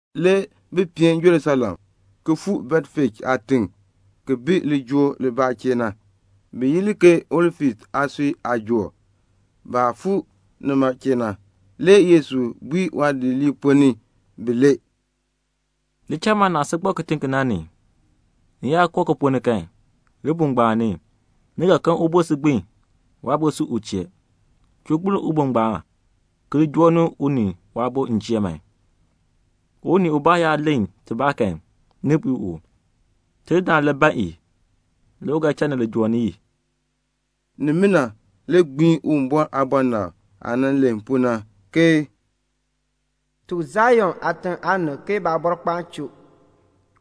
Le bi peen Jerusalem, le ki fuu Betfej aatiŋ, ki bi lijool libaa chee na, bi yi li ke Olif aasui aajool. Baah ti fuu nima chee na, le Yesu bui waadidiliib ponn ni bilee, "Li cha man naah si gbak kitiŋ ki na. Ni yaa koo ki ponn ni kan, libuul ngbaan ni, ni ga kan ubon si gbin, waabo si u chee. Chuu gbiln ubon ngbaan, ki li joo ni u ni waabo m chee man. Unii ubaa yaa len tibaa kan, ni bui u, 'Tidindaan le ban i.' Le u ga cha ni li joo ni i." Nimina le gbiin Uwumbɔr aabɔnabr aah nan len pu na, ke "Tuk Sion aatiŋ aanib ke Baabɔrkpaan choo.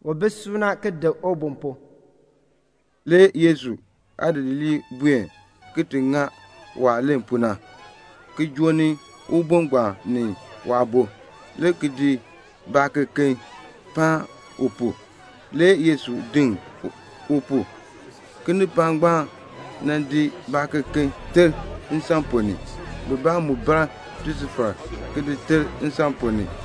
U bi suuna ki dik ubon pu." Le Yesu aadidiliib buen le ki ŋa waah len pu na, ki joo ni ubon ngbaan ni waabo, le ki di baakeken ki di paan u pu. Le Yesu diŋ u pu. Kinipaak ngbaan di baakeken ki di ter nsan ponn ni. Bibaa mu bar tisufar ki di ter nsan ponn ni.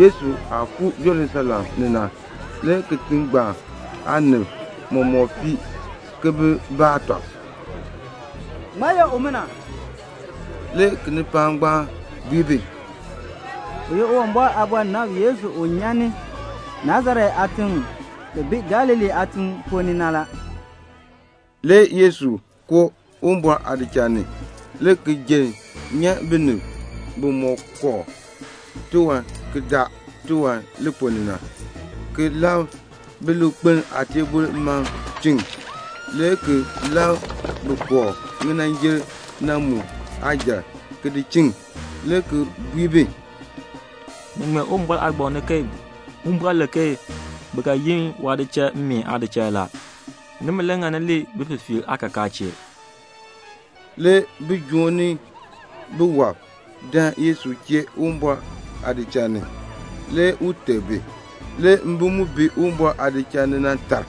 Yesu aah fuu Jerusalem ni na, le kitiŋ ngbaan aanib mɔmɔk fii ki bi baa tɔb, "Ŋmaa ye umina?" Le kinipaak ngbaan bui bi, "U ye Uwumbɔr aabɔnabr Yesu u nyan ni Nasaret aatiŋ ki bi Galilee aatiŋ ponn ni na." Le Yesu koo Uwumbɔr aadichal ni, le ki jenn nyan binib bimɔk kooh tiwan ki daa tiwan na li ponn ni, ki labr bilikpelm aateebl mam ki di chiŋ, le ki labr bin kooh ŋinanjil na mu aajal ki di chiŋ, le ki bui bi, "Ni ŋmee Uwumbɔr Aagbaŋ ni ke Uwumbɔr len ke bi ga yi waadichal mmeen aadichal; nimi le ŋani li bififiirb aakakaa chee." Le bijoom ni biwɔb dan Yesu chee Uwumbɔr aadichal ni. Le u teb bi. Le mbim mu bi Uwumbɔr aadichal ni na tar,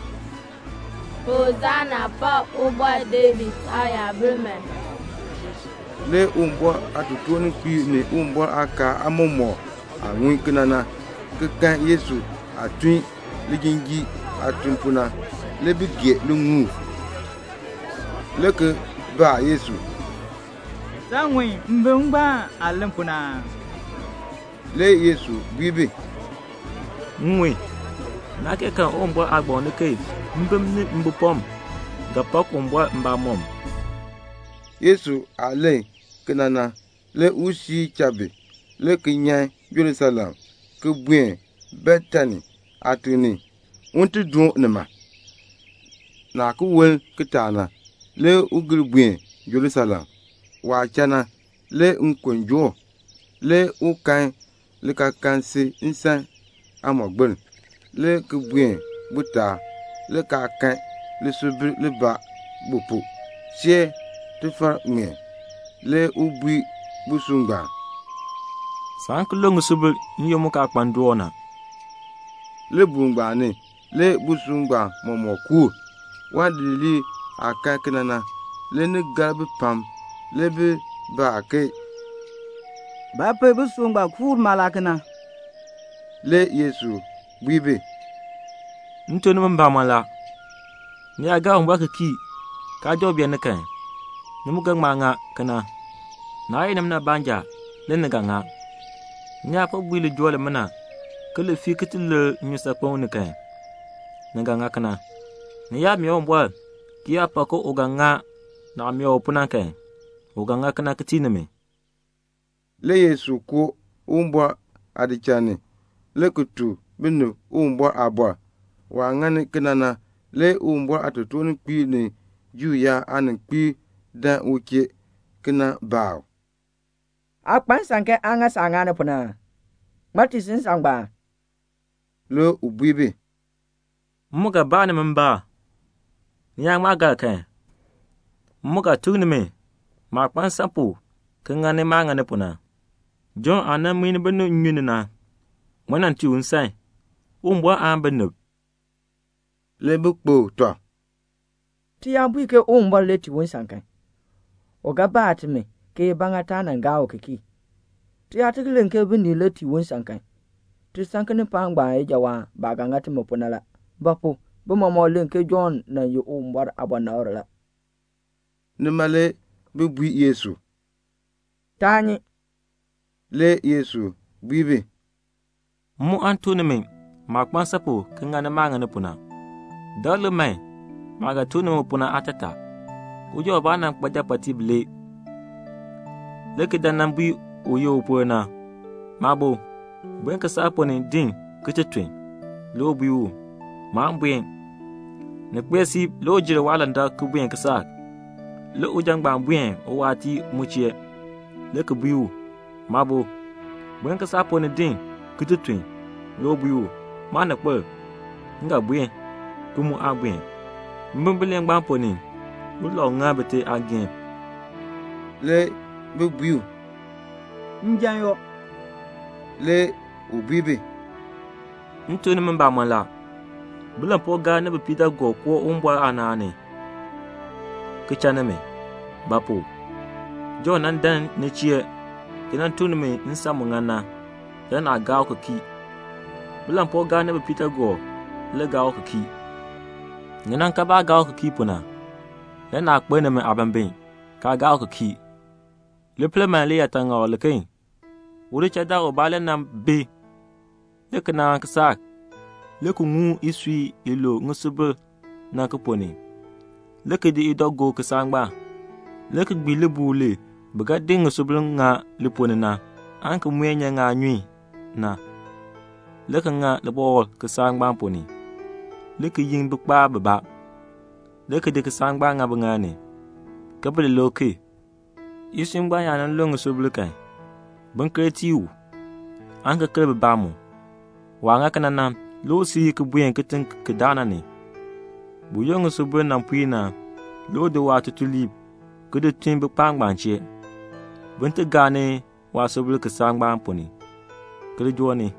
"Hosana, pakn Ubɔr David Aayabil man." Le Uwumbɔr aatotoorninkpiib ni Uwumbɔr aakaal aamɔmɔkb aah ŋun kena na, ki kan Yesu aah tun lijinjiir aatun pu na, le bi gee liŋuul, le ki baa Yesu, "Saa ŋun mbim ngbaan aah len pu na aa?" Le Yesu bui bi, "M ŋun. Naa kee karn Uwumbɔr aagbaŋ ni ke 'Mbim ni mbipɔm ga pak Uwumbɔr mbamɔm."' Yesu aah len kena na, le u siir cha bi, le ki nyan Jerusalem, le ki buen Betani aatiŋ ni, un ti doon nima. Le ki woln kitaak le u gir buen Jerusalem. Waah cha na, le nkon joo u. Le u kan likaakaln si nsan aamɔgbiln, le ki buen bu taab, le kaa kan ŋisubilbaa bu pu, see tifar ŋmeen. Le u bui busub ngbaan, "Saan ki lu ŋisubil n-yoonn mu kaa kpa ndoon na." Libuul ngbaan ni le busub ngbaan mɔmɔk kuur. Waadidiliib aah kan kena na, le ni gar bi pam. Le bi baa ke, "Ba pu busub ngbaan kuur mala kena?" Le Yesu bui bi, "M tuk nimi mbamɔn la, ni yaa gaa Uwumbɔr ki kii, kaa joo beeni kan, ni mu ga ŋma ŋa kena. Naa ye nimina baanja le ni ga ŋa. Ni yaa po bui lijool limina ke li fii ki ti lir nnyusaakpem ni kan, ni ga ŋa kena. Ni yaa mee Uwumbɔr ki yaa pak ke u ga ŋa naah mee u pu na kan, u ga ŋa kena ki tii nimi." Le Yesu koo Uwumbɔr aadichal ni, le ki tuk binib Uwumbɔr aaliin. Waah ŋani kena na, le Uwumbɔr aatotoor-ninkpiib ni Juu yaab aaninkpiib dan u chee le ki nan baa u, "Aa kpa nsan ke aa ŋa saah ŋani pu na aa? Ŋmaa tii si nsan ngbaan?" Le u bui bi, "M mu ga baa nimi mbaan. Ni yaa ŋma gar kan, m mu ga tuk nimi maah kpa nsan pu ki ŋani maah ŋani pu na. Jɔnn aah nan muin binib nnyun ni na, ŋmaa nan tii u nsan? Uwumbɔr aan binib?" Le bi kpokl tɔb, "Ti yaa bui ke Uwumbɔr le tii u nsan kan, u ga baa timi, ke ba ŋa taa gaa u ki kii. Ti yaa ki len ke binib le tii u nsan kan, ti san kinipaak ngbaan ijawaan baah ga ŋa timi pu na; bi mɔmɔk len ke Jɔnn nan ye Uwumbɔr aabɔnabr la." Nima le bi bui Yesu, "Taa nyi." Le Yesu bui bi, "M mu aan tuk nimi maah kpa nsan pu ki ŋani maah ŋani pu na." "Dakl lik man maah ga tuk nimi pu na aatataa. Uja ubaa nan kpa japɔɔtiib bilee, le ki dan nan bui un ye upol na, 'Maabo, buen kisaak ponn ni din ki ti tun.' Le u bui u, 'Maan buen.' Ni kpee siib le u jer waalandak ki buen kisaak. Le uja ngbaan buen uwaatiir chee le ki bui u, 'Maabo, buen kisaak ponn ni din ki ti tun.' Le u bui u, 'Maaninkpil, m ga buen,' ki mu aa buen. Mbim bilee ngbaan ponn ni, ulau ŋa bite aageehn?" Le bi bui u, "Njan yoo." Le u bui bi, "M tuk nimi mbamɔn la, bilampuugaab ni bipiidaagoob koo ni Uwumbɔr aanaan ni, ki cha nimi. Ba pu? Jɔnn nan dan ni chee ki nan tuk nimi nsan mu ŋan na. Le naa gaa u ki kii. Bilampuugaab ni bipiidaagoob le gaa u ki kii. Ni nan kan baah gaa u ki kii pu na, le naa kpeln nimi aabimbin, kaa gaa u ki kii." "Li pel man liyaataŋakl liken. Udichaldaan ubaa le nan bi le ki naan kisaak, le ki ŋum isui i lu ŋisubil na ki ponn ni, le ki di idɔ ki di gob kisaak ngbaan, le ki gbii libuul li bi ga di ŋisubil li ponn ni na aan ki muen ŋaanyun nyan, le ki ŋa libɔkl kisaak ngbaan ponn ni, le ki yin bikpaab bibaa, le ki di kisaak ngbaan ki di ŋa biŋaal ni, ke bi li lik ki. Isui ngbaan yaa nan lue ŋisubil kan, bin ker ki tii u, aan ki ker bibaa mu. Waah ŋa kena na, le u siir ki buen kitiŋ ki daa na ni. Buyoonn ŋisubil nan puir na, le u di waatutuliib ki di tun bikpaab ngbaan chee, bin ti gaa ni waasubil kisaak ngbaan ponn ni, ki li joo ni.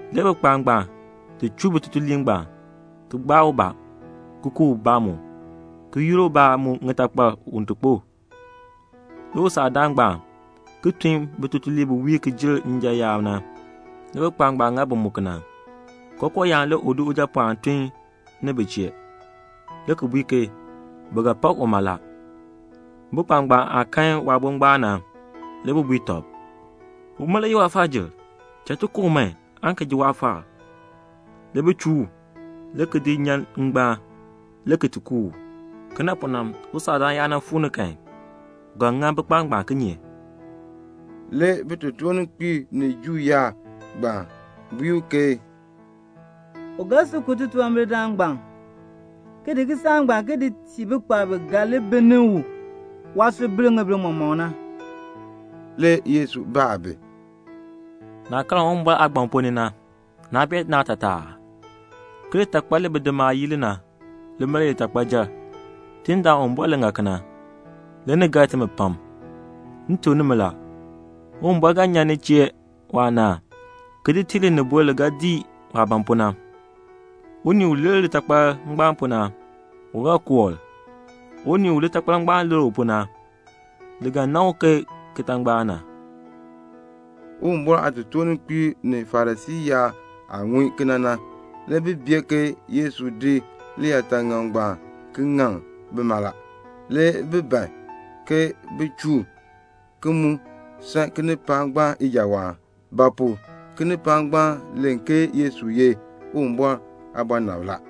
Le bikpaab ngbaan chuu waatutuliib ngbaan, ki gbaa ubaa, ki ku ubaa mu, ki yur ubaa mu ŋitakpal un ti kpo. Le usaakdaan ngbaan ki tun bitutuliib bi wiir ki jer njan yaab na. Le bikpaab ngbaan ŋa bi mu kena. Kookooyaan le u di ujapɔɔn ki di tun bi chee, le ki bui ke 'Bi ga pak uma la.' Bikpaab ngbaan aah kan waabo ngbaan na, le bi bui tɔb, 'Uma le ye waafaajil. Cha ti ku u man aan ki ji waafaal.' Le bi chuu u, le ki di nyan ngbaan, le ki ti ku u. "Kena pu na, usaakdaan yaa nan fuu ni kan, u ga ŋa bikpaab ngbaan kinye?" Le bitotoorninkpiib ni Juu yaab ngbaan bui ke, "U ga sil ku titunwambirdam ngbaan, ki di kisaak ngbaan ki tii bikpaab biken bi ga li bilni u waasubil ŋibin mɔmɔk na." Le Yesu baa bi, "Naah karn Uwumbɔr aagbaŋ ponn ni na, naa bee naatataa aa? ke 'Litakpal li bidimaab yii li na, lima le ye litakpayil. Tidindaan Uwumbɔr le ŋa kena, le ni gar timi pam.' M tuk nimi la, Uwumbɔr ga nyan ni chee waanaan, ki di tii linibol li ga dii waah ban pu na. Unii u lir litakpal ngbaan pu na, u ga koor. Unii u litakpal ngbaan lir u pu na, li ga nan u ke kitangbaak na." Uwumbɔr aatotoorninkpiib ni Farisii yaab aah ŋun kena na, le bi bee ke Yesu di liyaataŋakl ngbaan ki ŋaŋ bima la. Le bi ban ke bin chuu u, ki mu san kinipaak ngbaan ijawaan; ba pu? kinipaak ngbaan len ke Yesu ye Uwumbɔr aabɔnabr la.